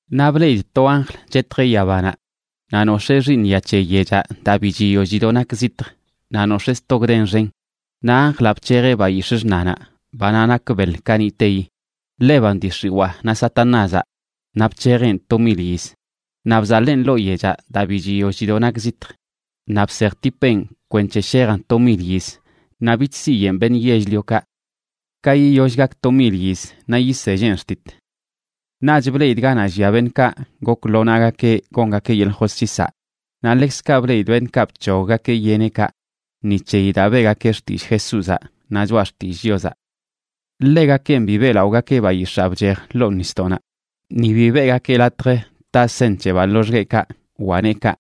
Naꞌ bleꞌidꞌ to anjl chetjeꞌ yabanaꞌ, naꞌ nox̱ee xiiṉya c̱he yechaꞌ daa bi chiyoll chido nak zitj naꞌ nox̱ee sto gden xen. Naꞌ anjlaꞌ bc̱hejeꞌ bayix̱ꞌ xṉanaꞌ, banaꞌ nak beḻ kaniꞌteyi, ḻeban dii x̱iwaa naꞌ Satanázaꞌ, naꞌ bc̱hejeꞌn to mil yiz. Naꞌ bzaḻeen ḻoo yechaꞌ daa bi chiyoll chido nak zitj, naꞌ bsejtipeꞌn kwenc̱he shejan to mil yiz naꞌ bich siyeꞌn beṉꞌ yell-liokaꞌ. Ka yiyoll gak to mil yiz naꞌ yiselleꞌn xtit. Naꞌch bleꞌidꞌ ganaꞌ llia beṉꞌkaꞌ gok lo naꞌgakeꞌ gongakeꞌ yeḻꞌ josc̱hisaꞌ. Naꞌ ḻekzkaꞌ bleꞌidꞌ beṉꞌkaꞌ bc̱hoggakeꞌ yeneꞌkaꞌ ni c̱heyi daa beꞌgakeꞌ xtillꞌ Jesúzaꞌ naꞌ choꞌa xtillꞌ Chiozaꞌ. Ḻegakenꞌ bi beꞌlaꞌogakeꞌ bayix̱aa bchej ḻoo nisdoꞌnaꞌ ni bi beꞌgakeꞌ latj taꞌ seṉ c̱hebaꞌ loxgueꞌkaꞌ wa neekaꞌ.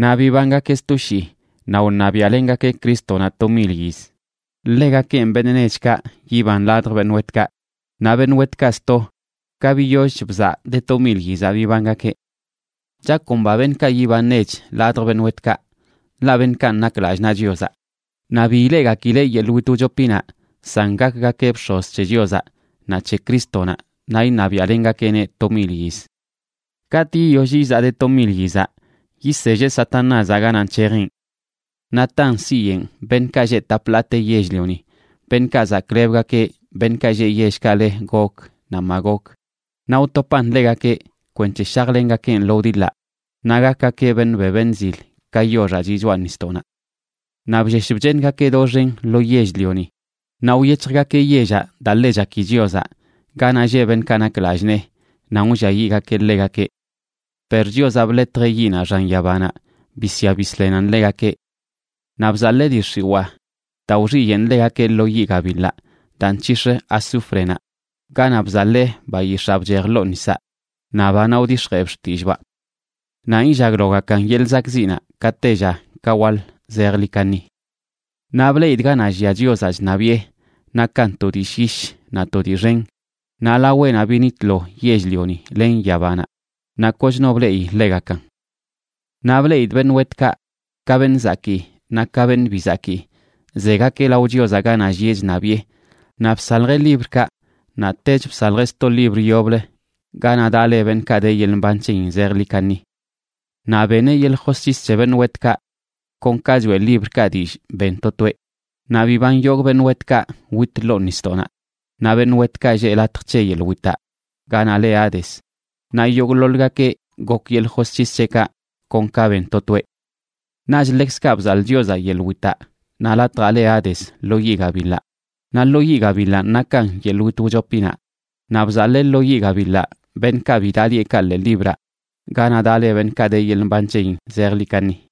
Naꞌ bibangakeꞌ sto shii naꞌ wṉabiaꞌlengakeꞌ Crístonaꞌ to mil yiz. Ḻegakenꞌ beṉꞌ nechkaꞌ yiban ladj beṉꞌ wetkaꞌ. Naꞌ beṉꞌ wetkaꞌ sto, ka biyollch bzaꞌ de to mil yizaꞌ bibangakeꞌ. Chakomba beṉꞌkaꞌ yiban nech ladj beṉꞌ wetkaꞌ, ḻaꞌ beṉꞌkanꞌ nak lallꞌ naꞌ Chiozaꞌ. Naꞌ bi ileꞌgakileꞌ yeḻꞌ wit wchopinaꞌ, san gakgakeꞌ bx̱oz c̱he Chiozaꞌ naꞌ c̱he Crístonaꞌ naꞌ iṉabiaꞌlengakeꞌneꞌ to mil yiz. Katꞌ yiyoll izaꞌ de to mil yizaꞌ, yiselleꞌ Satanázaꞌ ganaꞌ nc̱hejeꞌn. Naꞌ tan siyeꞌn beṉꞌkaꞌ lleꞌ tap ḻaate yell-lioni, beṉꞌkaꞌ zaklebgakeꞌ beṉꞌkaꞌ lleꞌ yellkaꞌ le Gog naꞌ Magog, naꞌ wtopan ḻegakeꞌ kwenc̱he shajlengakeꞌn lo wdiḻaꞌ, naꞌ gakgakeꞌ beṉꞌ be beṉꞌ zil ka yoxaꞌ chiꞌ choꞌa nisdoꞌnaꞌ. Naꞌ bllesh bcheeṉgakeꞌ doxen lo yell-lioni naꞌ wyec̱hjgakeꞌ yellaꞌ daa ḻe chaki Chiozaꞌ, ganaꞌ lleꞌ beṉꞌkaꞌ nak lallꞌ nee, nan wlliayiꞌgakeꞌ ḻegakeꞌ. Per Chiozaꞌ bḻetjeꞌ yiꞌnaꞌ xan yabanaꞌ bisya bisḻenan ḻegakeꞌ. Naꞌ bzaḻee dii x̱iwaa, daa wxiyeꞌn ḻegakeꞌ, lo yiꞌ gabiḻaꞌ daa nc̱hix̱ꞌ azúfrenaꞌ, ganaꞌ bzaḻee bayix̱aa bchej ḻoo nisaꞌ naꞌ banaꞌ wdix̱jeeb xtillꞌbaꞌ. Nanꞌ illaglogakan yeḻꞌ zakꞌziꞌnaꞌ ka tella ka waḻ zejḻi kaṉi. Naꞌ bleꞌidꞌ ganaꞌ llia Chiozaꞌ chṉabiꞌe, nakan to dii llyish naꞌ to dii xen. Naꞌ laweꞌnaꞌ binitlo yell-lioni len yabanaꞌ, naꞌ koch no bleꞌi ḻegakan. Naꞌ bleꞌidꞌ beṉꞌ wetkaꞌ, ka beṉꞌ zakii naꞌ ka beṉꞌ bi zakii, zegakeꞌ lao Chiozaꞌ ganaꞌ llieꞌ chṉabiꞌe. Naꞌ bsaljeꞌ librkaꞌ, naꞌtech bsaljeꞌ sto libr yoblə ganaꞌ daꞌ le beṉꞌkaꞌ de yeḻꞌ mban c̱heyin zejḻi kaṉi. Naꞌ beneꞌ yeḻꞌ josc̱his c̱he beṉꞌ wetkaꞌ kon ka choeꞌ librkaꞌ dillꞌ ben to toeꞌ. Naꞌ biban yogꞌ beṉꞌkaꞌ wit ḻoo nisdoꞌnaꞌ, naꞌ beṉꞌ wetkaꞌ lleꞌ latj c̱he yeḻꞌ witaꞌ ganaꞌ le Hades,a naꞌ yogꞌḻoḻgakeꞌ gok yeḻꞌ josc̱his c̱heꞌkaꞌ kon ka ben to toeꞌ. Naꞌch ḻekzkaꞌ bzaḻꞌ Chiozaꞌ yeḻꞌ witaꞌ naꞌ latjaꞌ le Hades lo yiꞌ gabiḻaꞌ. Naꞌ lo yiꞌ gabiḻanꞌ nakan yeḻꞌ wit wchopinaꞌ. Naꞌ bzaḻee lo yiꞌ gabiḻaꞌ beṉꞌkaꞌ bi daꞌ lieꞌkaꞌ ḻee libraꞌ ganaꞌ daꞌ le beṉꞌkaꞌ de yeḻꞌ mban c̱heyin zejḻi kaṉi.